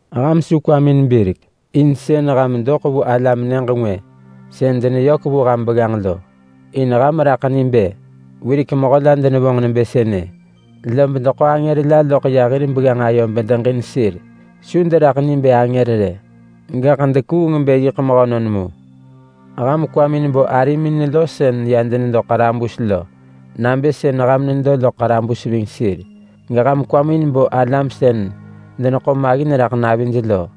Ham su kwamin birek in sën ham doḳ vu alam nyëġ ngwë sën deneyök ham begganġ lo. In ham raḳ ni bë wirek mehö la denevonġ nebë sënë, lob deḳo angër la loḳ ya hir begganġ ayo bedeġin sir. Su deraḳ ni bë angër rë, gaḳ dekuung bë yiḳ mehönon mu. Ham kwamin bo arimin lo sën ya denedo ḳarabus lo, nabë sën ham nedo loḳ ḳarabus ving sir. Geham kwamin bo alam sën deneḳo maggin raḳ navij lo,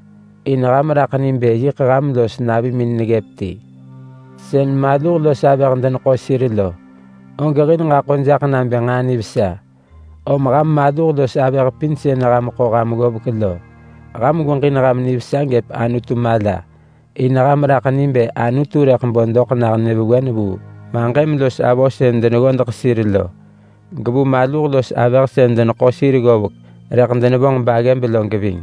in ham raḳ ni bë yiḳ ham los navimin neggëp ti. Sën maluh los avëh deneḳo sir lo, og hil ġaḳo jaḳ nabë nġaa nivesa. Om ham maluh los avëh pin sën ham ḳo ham ggovek lo, ham gweġin ham nivesa gëp Anutu mala. In ham raḳ ni bë Anutu rëḳ bo doḳ nah nyëvewen vu maġëm los avö sën deneggodeḳ sir lo, gevu maluh los avëh sën deneḳo sir ggovek rëḳ denevonġ baggëb lo geving.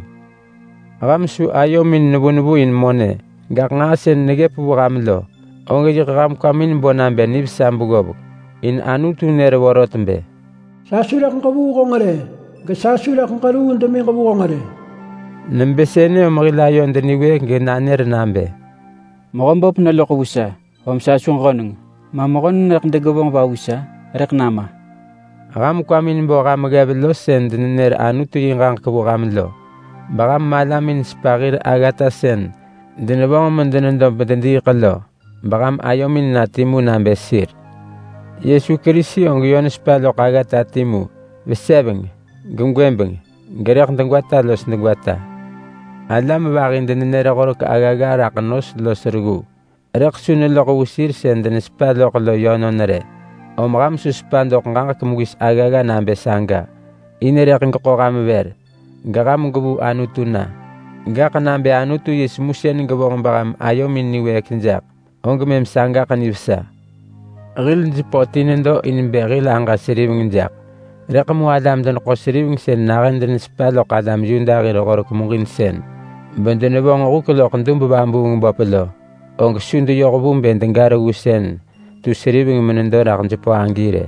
Ham su ayomin nevu nevu in monë, gaḳ nġaa sën neggëp vu ham lo, og yiḳ ham kwamin bo nabë nivesa beggovek. In Anutu nër vorot bë: “Sa su rëḳ ġevuu honġ rë, gesa su rëḳ ġeruu demiġ vu honġ rë.” Nebë sënë om hil ayod niwëëk genanër nabë: “Mehöböp neloḳ vu sa, om sa su ġöneng. Ma mehönon rëḳ degevonġ va vu sa? Rëḳ nama!” Ham kwamin bo ham ggev lo sën denenër Anutu yi ġaġek vu ham lo. Beham malamin sepa hir aggata sën denevonġ medenedo bedediiḳ lo, beham ayomin na timu nabë sir. Yesu Kerisi og yö nesepa loḳ aggata timu, veseveng, gegwëbeng, gerëḳ degwata los degwata. Alam vahi denenër horek aggagga raḳ nos los reggu, rëḳ su neloḳ vu sir sën denesepa loḳ lo yönon rë. Om ham su sepa doḳ ġaġek mewis aggagga nabë saga, in rëḳ geḳo ham vër geham gwevuu Anutu na. Gaḳ nabë Anutu yi semusën gevonġ beham ayomin niwëëk jaḳ, og mëm sagaḳ nivesa. Hil jepö ti nedo in bë hil aġa seriveng jaḳ. Rëḳ mu alam-deneḳo-seriveng sën nahën denesepa loḳ alam Yuda hir Horek muġinsën bedenevonġ huk loḳ dub-vabuung-böp lo, og su deyoh vu bë dega reggu sën tu seriveng menedo raḳ jepö agi rë.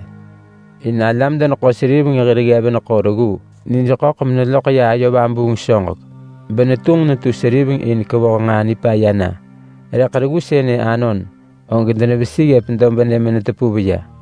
In alam-deneḳo-seriveng hir ggev neḳo reggu nij ḳöḳ beneloḳ ya ayo vabuung soġek benetunġ netu seriveng in kevoh nġaa nipaya na. Rëḳ reggu sënë anon, og denevesi ggëp dobnë menetepuv ya.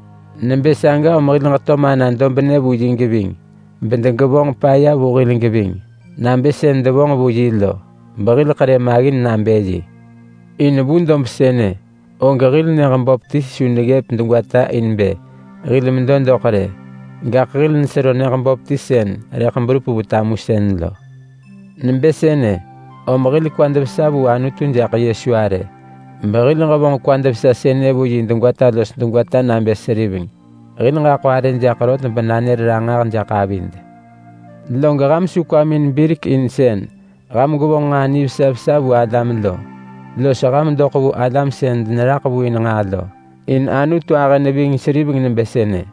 Nebë saga om hil ġeto mana dobnë vu yi geving, bedegevonġ paya vu hil geving nabë sën devonġ vu yi lo behil ḳerë maggin nabë yi. In vu dob sënë, og hil nyëġ böp ti su neggëp degwata in bë hil medo doḳ rë. Gaḳ hil nesero nyëġ böp ti sën rëḳ berup vu tamusën lo. Nebë sënë, om hil kwad vesa vu Anutu jaḳ Yesu arë, behil ġevonġ kwad vesa sënë vu yi degwata los degwata nabë seriveng. Hil ġaḳo arë jaḳ rot benanër ranġah jaḳ avid. Log ham su kwamin birek in sën ham gwevonġ nġaa nivesa vesa vu alam lo, los ham doḳ vu alam sën deneraḳ vu in nġaa lo. In Anutu ahë neving seriveng nebë sënë.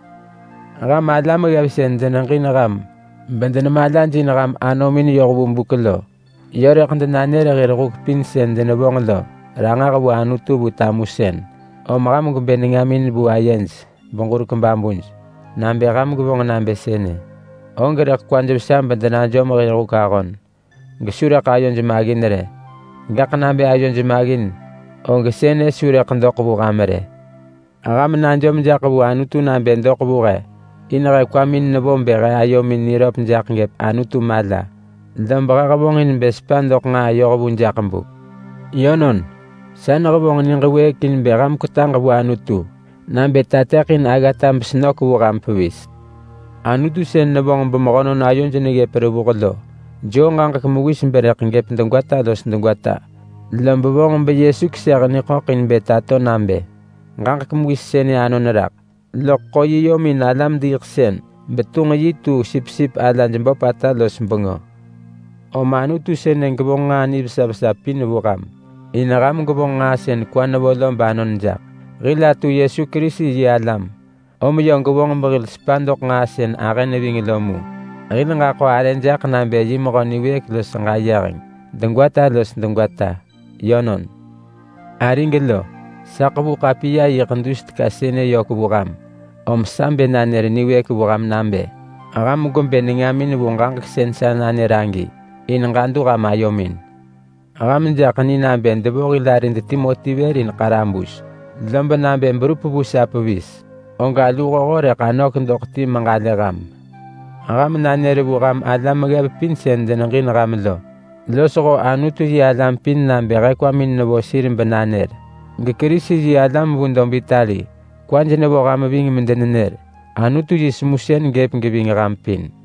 Ham alam ggev sën deneġin ham bedenemalajin ham anomin yoh vu buk lo, yö rëḳ denanër hir huk pin sën denevonġ lo ranġah vu Anutu vu tamusën. Om ham gwebë nengamin vu ayej beġurek babuj. Nabë ham gwevonġ nabë sënë, og rëḳ kwaj vesa bedenajom hir huk ahon gesu rëḳ ayoj maggin rë. Gaḳ nabë ayoj maggin, og sënë su rëḳ doḳ vu ham rë. Ham najom jaḳ vu Anutu nabë doḳ vu he. In he kwamin nevo bë he ayomin niröp raḳ ggëp Anutu mala, lob he hevonġin bë sepa doḳ nġaa yohvu jaḳ buk. Yönon, sa nehevonġ niġ wëëk in bë ham kwetaġ vu Anutu nabë tateḳin aggata besenök vu ham pevis. Anutu sën nevonġ bemehönon ayoj neggëp revuh lo, joo ġaġek mewis berëḳ gëp degwata los degwata. Lob vonġ beYesu keseh niḳöḳ in bë tato nabë ġaġek mewis sënë anon raḳ. Loḳ ḳo yi yom in alam-diiḳsën betunġ yi tu sipsip alaj böpata los bengö. Om Anutu sënë gevonġ nġaa nivesa vesa pin vu ham, in ham gwevonġ nġaa sën kwa nevo lo banon jaḳ. Hil atu Yesu Kerisi yi alam om yö gevonġ behil sepa doḳ nġaa sën ahë neving lo mu. Hil ġaḳo arë jaḳ nabë yi mehö niwëëk los ġayeheng degwata los degwata. Yönon. Arig lo, sa ḳevu ḳapiya yiḳ dus teka sënë vu ham, om sa bë nanër niwëëk vu ham nabë ham gwebë nengamin vu ġaġek sën sa nanër agi, in ġadu ham ayomin. Ham jaḳ ni nabë devo hil arid Timoti vër in ḳarabus, lob nabë berup vu sa pevis, og aluhoho rëḳ anök doḳ ti meġalë ham. Ham nanër vu ham alam ggev pin sën deneġin ham lo losho Anutu-yi-alam pin nabë he kwamin nevo sir benanër. GeKerisi-yi-alam vu dob Itali kwaj nevo ham ving medenenër. Anutu yi semusën gëp geving ham pin.